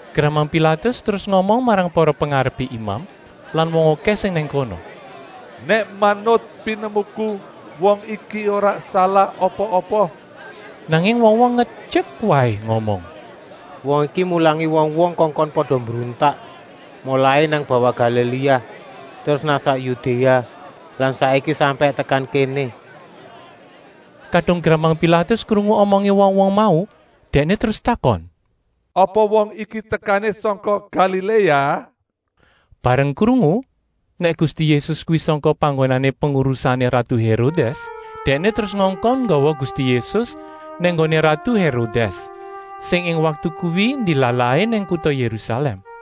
Gramang Pilatus terus ngomong marang para pengarepé imam lan wong okèh sing nang kono: “Nèk manut pinemuku wong iki ora salah apa-apa.” Nanging wong-wong ngetyek waé ngomong: “Wong iki mulangi wong-wong kongkon pada mbruntak, molai nang bawah Galiléa terus nang sak Yudéa lan saiki sampèk tekan kéné.” Kadung gramang Pilatus krungu omongé wong-wong mau, dèkné terus takon: “Apa wong iki tekané sangka Galiléa?” Bareng krungu nèk Gusti Yésus kuwi sangka panggonan pengurusané ratu Hérodès, dèkné terus ngongkon nggawa Gusti Yésus nang nggoné ratu Hérodès, sing ing waktu kuwi ndilalahé nang kuta Yérusalèm.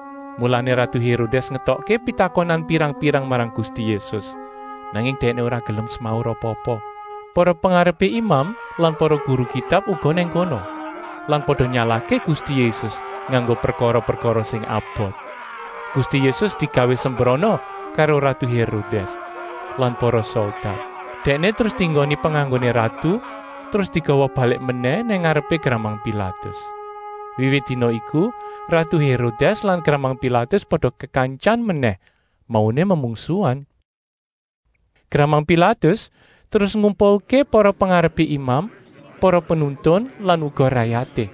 Mulané ratu Hérodès ngetokké pitakonan pirang-pirang marang Gusti Yésus, nanging Dèkné ora gelem semaur apa-apa. Para pengarepé imam lan para guru Kitab uga nang kono lan pada nyalahké Gusti Yésus nganggo prekara-prekara sing abot. Gusti Yésus digawé sembrana karo ratu Hérodès lan para soldat. Dèkné terus dienggoni penganggoné ratu terus digawa balik menèh nang ngarepé gramang Pilatus. Wiwit dina iku ratu Hérodès lan gramang Pilatus pada kekantyan menèh, mauné memungsuhan. Gramang Pilatus terus ngumpulké para pengarepé imam, para penuntun lan uga rayaté.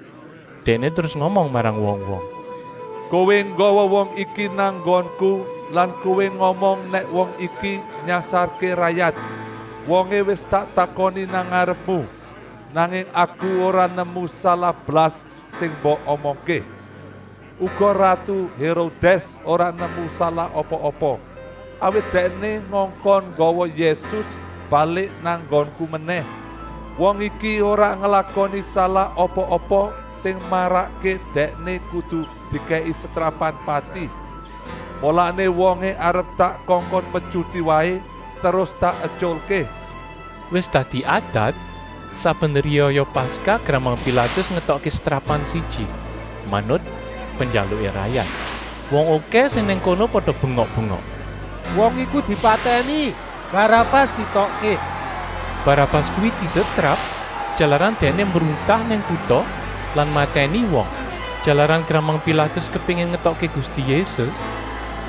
Dèkné terus ngomong marang wong-wong: “Kowé nggawa wong iki nang nggonku lan kowé ngomong nèk wong iki nyasarké rayat. Wongé wis tak takoni nang ngarepmu, nanging aku ora nemu salah blas sing mbok omongké. Uga ratu Hérodès ora nemu salah apa-apa, awit dèkné ngongkon nggawa Yésus balik nang nggonku menèh. Wong iki ora nglakoni salah apa-apa sing marakké Dèkné kudu dikèki setrapan pati. Mulané wongé arep tak kongkon metyuti waé terus tak etyulké.” ( Wis dadi adat, saben riyaya Paskah gramang Pilatus ngetokké setrapan siji, manut penjaluké rayat.) Wong okèh sing nang kono pada bengok-bengok: “Wong iku dipatèni! Barabas dietokké.” Barabas kuwi disetrap, jalaran dèkné mbruntak nang kuta lan matèni wong. Jalaran gramang Pilatus kepéngin ngetokké Gusti Yésus,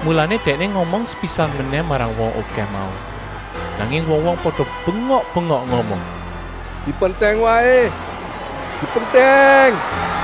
mulané dèkné ngomong sepisan menèh marang wong okèh mau. Nanging wong-wong pada bengok-bengok ngomong: “Dipentèng waé! Dipentèng!”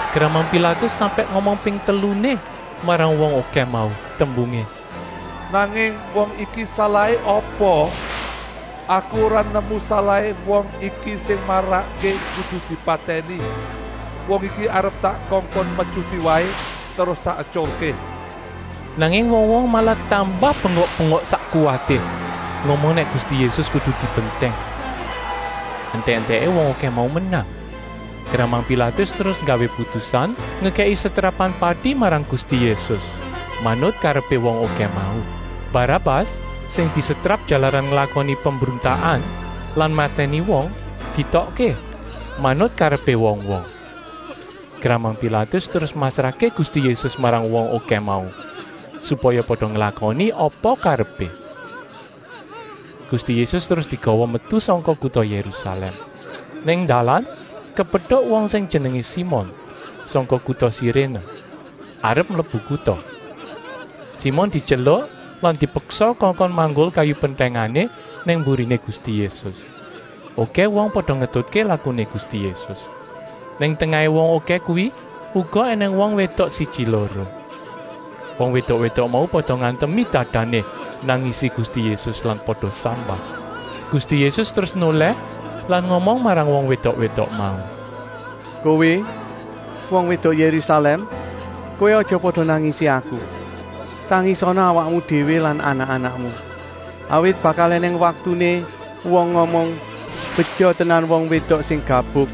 Gramang Pilatus sampèk ngomong ping teluné marang wong okèh mau, tembungé: “Nanging wong iki salahé apa? Aku ora nemu salahé wong iki sing marakké kudu dipatèni. Wong iki arep tak kongkon metyuti waé terus tak etyulké.” Nanging wong-wong malah tambah bengok-bengok sak kuwaté, ngomong nèk Gusti Yésus kudu dipentèng. Entèk-entèké wong okèh mau menang. Gramang Pilatus terus nggawé putusan ngekèki setrapan pati marang Gusti Yésus, manut karepé wong okèh mau. Barabas, sing disetrap jalaran nglakoni pembruntakan lan matèni wong, dietokké, manut karepé wong-wong. Gramang Pilatus terus masrahké Gusti Yésus marang wong okèh mau, supaya pada nglakoni apa karepé. Gusti Yésus terus digawa metu sangka kuta Yérusalèm. Nang dalan kepetuk wong sing jenengé Simon, sangka kuta Siréné, arep mlebu kuta. Simon dityeluk lan dipeksa kongkon manggul kayu pentèngané nang mburiné Gusti Yésus. Okèh wong pada ngetutké lakuné Gusti Yésus. Nang tengahé wong okèh kuwi uga ènèng wong wédok siji-loro. Wong wédok-wédok mau pada ngantemi dadané nangisi Gusti Yésus lan pada sambat. Gusti Yésus terus nolèh lan ngomong marang wong wédok-wédok mau: “Kowé, wong wédok Yérusalèm, kowé aja pada nangisi Aku; tangisana awakmu déwé lan anak-anakmu. Awit bakal ènèng waktuné wong ngomong: ‘Beja tenan wong wédok sing gabuk,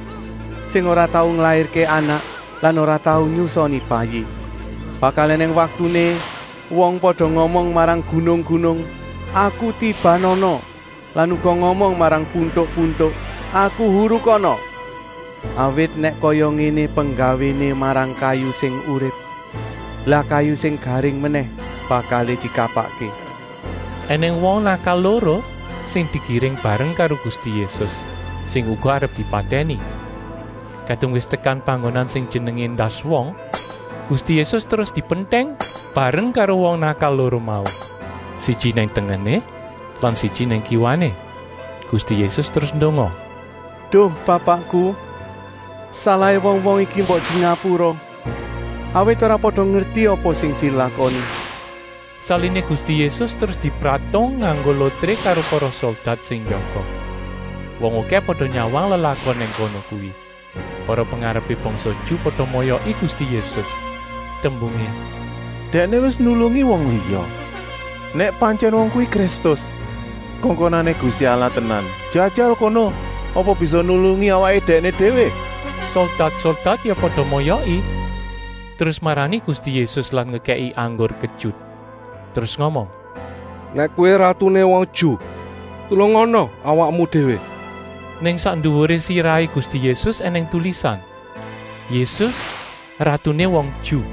sing ora tau nglairké anak lan ora tau nyusoni bayi!’ Bakal ènèng waktuné wong pada ngomong marang gunung-gunung: ‘Aku tibanana,’ lan uga ngomong marang puntuk-puntuk: ‘Aku hurukana!’ Awit nèk kaya ngéné penggawéné marang kayu sing urip, lah kayu sing garing menèh bakal dikapakké?” Enèng wong nakal loro sing digiring bareng karo Gusti Yésus, sing uga arep dipatèni. Kadung wis tekan panggonan sing jenengé “Endas wong,” Gusti Yésus terus dipentèng bareng karo wong nakal loro mau, siji nang tengené lan siji nang kiwané. Gusti Yésus terus ndonga: “Duh Bapakku, salahé wong-wong iki mbok dingapura, awit ora pada ngerti apa sing dilakoni.” Saliné Gusti Yésus terus dipratung nganggo lotré karo para soldat sing njaga. Wong okèh pada nyawang lelakon nang kono kuwi. Para pengarepé bangsa Ju pada moyoki Gusti Yésus, tembungé: “Dèkné wis nulungi wong liya. Nèk pantyèn wong kuwi Kristus, kongkonané Gusti Allah tenan, jajal kono apa bisa nulungi awaké dèkné déwé.” Soldat-soldat ya pada moyoki terus marani Gusti Yésus lan ngekèki anggur ketyut. Terus ngomong: “Nèk Kowé ratuné wong Ju, tulungana awakmu déwé.” Nang sak nduwuré sirahé Gusti Yésus ènèng tulisan: “Yésus, ratuné wong Ju.”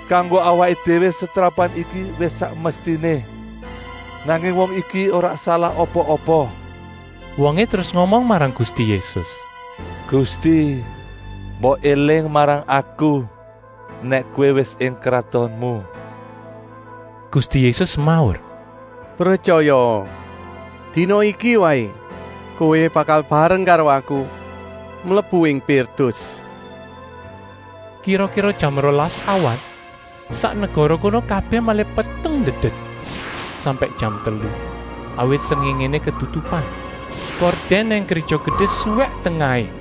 Kanggo awaké déwé setrapan iki wis sak mestiné. Nanging wong iki ora salah apa-apa.” Wongé terus ngomong marang Gusti Yésus: “Gusti, mbok éling marang aku nèk Kowé wis ing kratonmu.” Gusti Yésus semaur: “Pretyayaa, dina iki waé kowé bakal bareng karo Aku mlebu ing Pirdus.” Kira-kira jam rolas awan sak negara kono kabèh malih peteng ndedet, sampèk jam telu, awit srengéngéné ketutupan. Kordèn nang Gréja Gedé suwèk tengahé.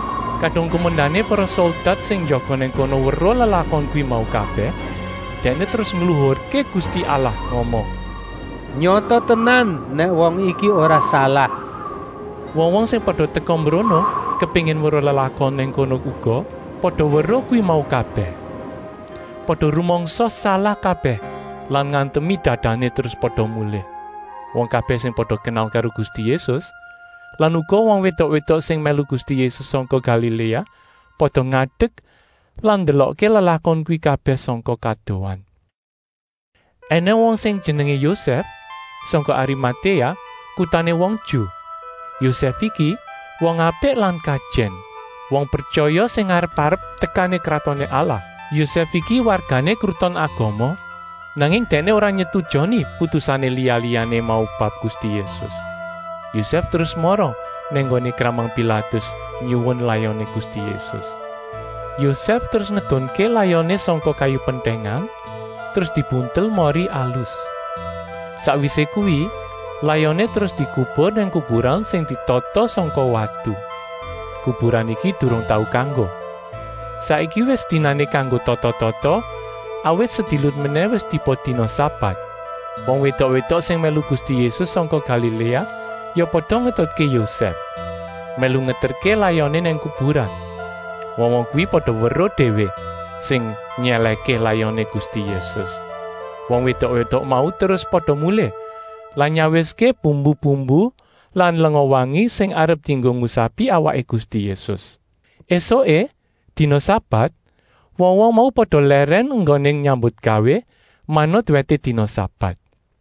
Kadung kumendané para soldat sing jaga nang kono weruh lelakon kuwi mau kabèh, dèkné terus ngluhurké Gusti Allah ngomong: “Nyata tenan nèk wong iki ora salah.” Wong-wong sing pada teka mbrono kepéngin weruh lelakon nang kono uga pada weruh kuwi mau kabèh. Pada rumangsa salah kabèh lan ngantemi dadané terus pada mulih. Wong kabèh sing pada kenal karo Gusti Yésus lan uga wong wédok-wédok sing mèlu Gusti Yésus sangka Galiléa pada ngadek lan ndelokké lelakon kuwi kabèh sangka kadohan. Enèng wong sing jenengé Yosèf, sangka Arimatéa, kutané wong Ju. Yosèf iki wong apik lan kajèn, wong pretyaya sing ngarep-arep tekané Kratoné Allah. Yosèf iki wargané Kruton Agama, nanging dèkné ora nyetujoni putusané liya-liyané mau bab Gusti Yésus. Yosèf terus mara nang nggoné gramang Pilatus nyuwun layoné Gusti Yésus. Yosèf terus ngedunké layoné sangka kayu pentèngan terus dibuntel mori alus. Sakwisé kuwi layoné terus dikubur nang kuburan sing ditatah sangka watu. Kuburan iki durung tau kanggo. Saiki wis dinané kanggo tata-tata, awit sedilut menèh wis tiba dina sabat. Wong wédok-wédok sing mèlu Gusti Yésus sangka Galiléa ya pada ngetutké Yosèf, mèlu ngeterké layoné nang kuburan. Wong-wong kuwi pada weruh déwé sing nyèlèhké layoné Gusti Yésus. Wong wédok-wédok mau terus pada mulih lan nyawiské bumbu-bumbu lan lenga-wangi sing arep dienggo ngusapi awaké Gusti Yésus. Esuké, dina sabat, wong-wong mau pada lèrèn enggoné nyambutgawé, manut wèté dina sabat.